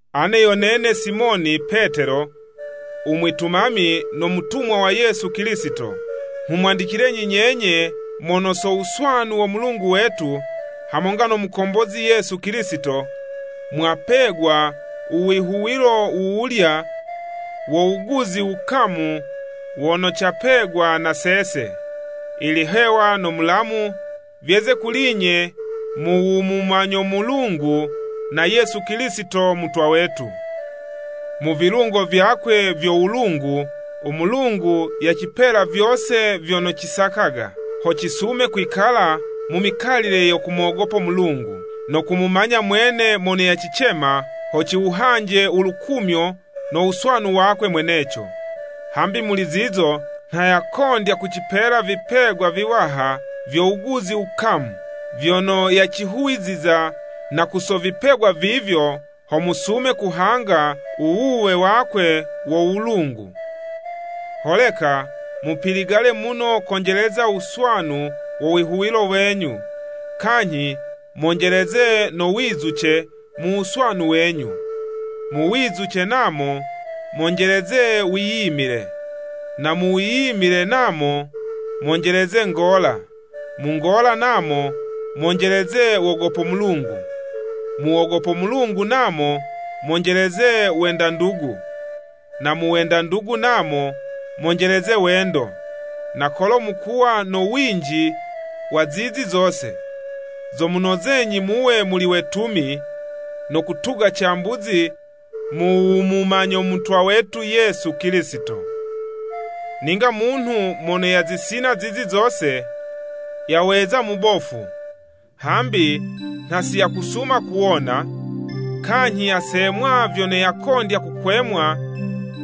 Ane yo nene Simoni Petelo, u mwitumami no mutumwa wa Yesu Kilisito. Nghumwandicilenyi nyenye mono so wuswanu wo Mulungu wetu, hamonga no Mukombozi Yesu Kilisito, mwapegwa u wihuwilo wuwulya wo wuguzi wukamu wono capegwa na sese. Ilihewa no Mulamu vyeze kuli'nye mu wumumanyo Mulungu, na Yesu Kilisito Mutwa wetu. Mu vilungo vyakwe vyo wulungu, u Mulungu yacipela vyose vyono cisakaga, ho cisume kwikala mu mikalile yo kumogopo Mulungu, no kumumanya mwene mono yacicema ho ciwuhanje ulukumyo no wuswanu wakwe mweneco. Hambi muli zizo nha yakondya kucipela vipegwa viwaha vyo wuguzi wukamu vyono yacihuwiziza, na ku so vipegwa vivyo, ho musume kuhanga u wuwe wakwe wo wulungu. Holeka mupiligale muno konjeleza wuswanu wo wihuwilo wenyu, kanyhi monjeleze no wizuce mu wuswanu wenyu, mu wizuce namo, monjeleze wiyimile, na mu wiyimile namo, monjeleze ngola, mu ngola namo, monjeleze wogopo Mulungu. Mu wogopo Mulungu namo, monjeleze wenda ndugu, na mu wenda ndugu namo, monjeleze wendo. Na kolo mukuwa no winji wa zizi zose, zomunozenyi muwe muli wetumi, no kutuga cambuzi mu wumumanya Mutwa wetu Yesu Kilisito. Ninga munhu mono yazisina zizi zose, yaweza mubofu, hambi nha si yakusuma kuwona, kanyhi yasemwa vyono yakondya kukwemwa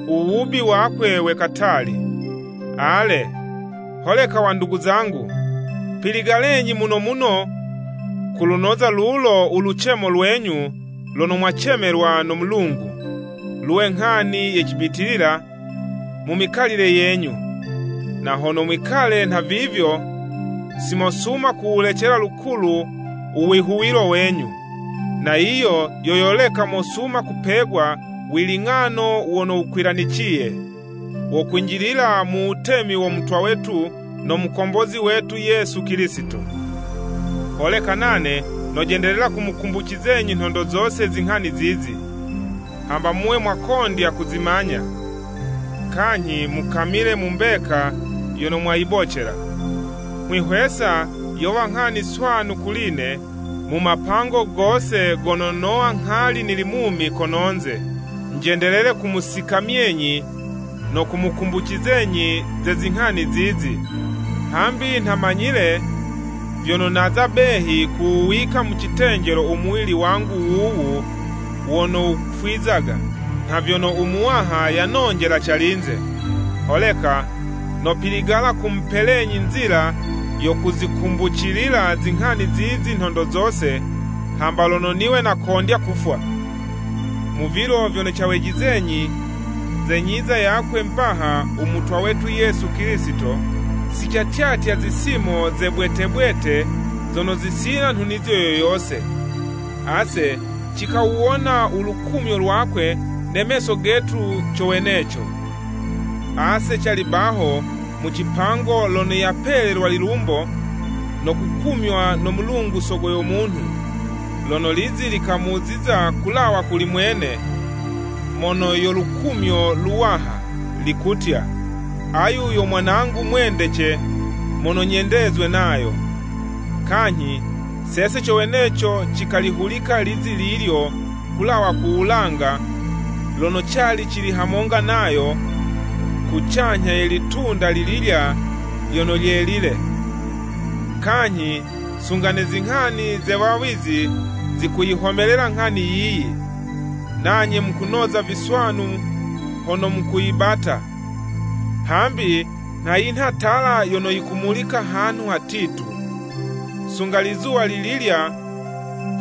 u wubi wakwe we katali. Ale, holeka, wandugu zangu, piligalenyi muno muno kulunoza lulo ulucemo lwenyu lono mwacemelwa no Mulungu, luwe nghani ye cibitilila mu mikalile yenyu, na hono mwikale nhavivyo, simosuma kuwulecela lukulu uwihuwilo wenyu. Na yiyo yo yoleka mosuma kupegwa wiling'ano wono wukwilaniciye, wo kwinjilila mu wutemi wo Mutwa wetu no Mukombozi wetu Yesu Kilisito. Holeka nane nojendelela kumukumbucizenyi nhondo zose zinghani zizi, hamba muwe mwakondya kuzimanya, kanyhi mukamile mu mbeka yono mwayibocela. Nghwihwesa yowa nghani swanu kuli'ne, mu mapango gose gono nowa nghali nili mumi kononze, njendelele kumusikamyenyi no kumukumbucizenyi ze zinghani zizi. Hambi nha manyile vyono naza behi kuwuwika mu citenjelo umuwili wangu wuwu wono wufwizaga, nha vyono u Muwaha yanonjela calinze. Holeka nopiligala kumupelenyi nzila yo kuzikumbucilila zinghani zizi nhondo zose, hamba lono niwe nakondya kufwa. Mu vilo vyono cawejizenyi ze nyiza yakwe mbaha u Mutwa wetu Yesu Kilisito, sicatyatya zisimo ze cibwete bwete zono zisina nhunizo yo yose. Ase cikawuwona ulukumyo lwakwe ne meso getu co weneco. Ase cali baho mu cipango lono yapelelwa lilumbo, no kukumywa no Mulungu Sogo yo munhu, lono lizi likamuziza kulawa kuli mwene, mono yo Lukumyo Luwaha, likutya, “Ayu yo Mwanangu mwendece mono nyendezwe nayo.” Kanyhi, sese co weneco cikalihulika lizi lilyo kulawa ku wulanga lono cali cili hamonga nayo kucanyha ye litunda lililya lyono lyelile. Kanyhi sunga ne zinghani ze wawizi zikuyihomelela nghani yiyi, nanye mukunoza viswanu hono mukuyibata, hambi nha yinha tala yono yikumulika hanhu hatitu, sunga lizuwa lililya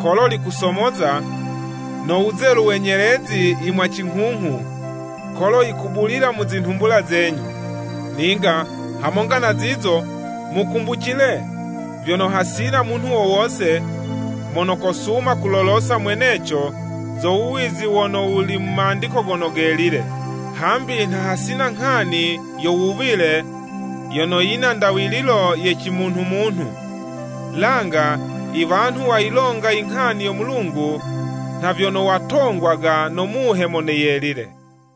kolo likusomoza, no wuzelu we nyelezi yimwacinghunghu, kolo wukubulila mu zinhumbula zenyu. Ninga hamonga na zizo, mukumbucile vyono, hasina munhu wo wose, mono kosuma kulolosa mweneco zo wuwizi wono wuli mu Mandiko Gono Gelile. Hambi nha hasina nghani yo wuwile yono yina ndawililo ye cimunhumunhu, langa iwanhu wayilonga inghani yo Mulungu nha vyono watongwaga no Muhe Mono Yelile.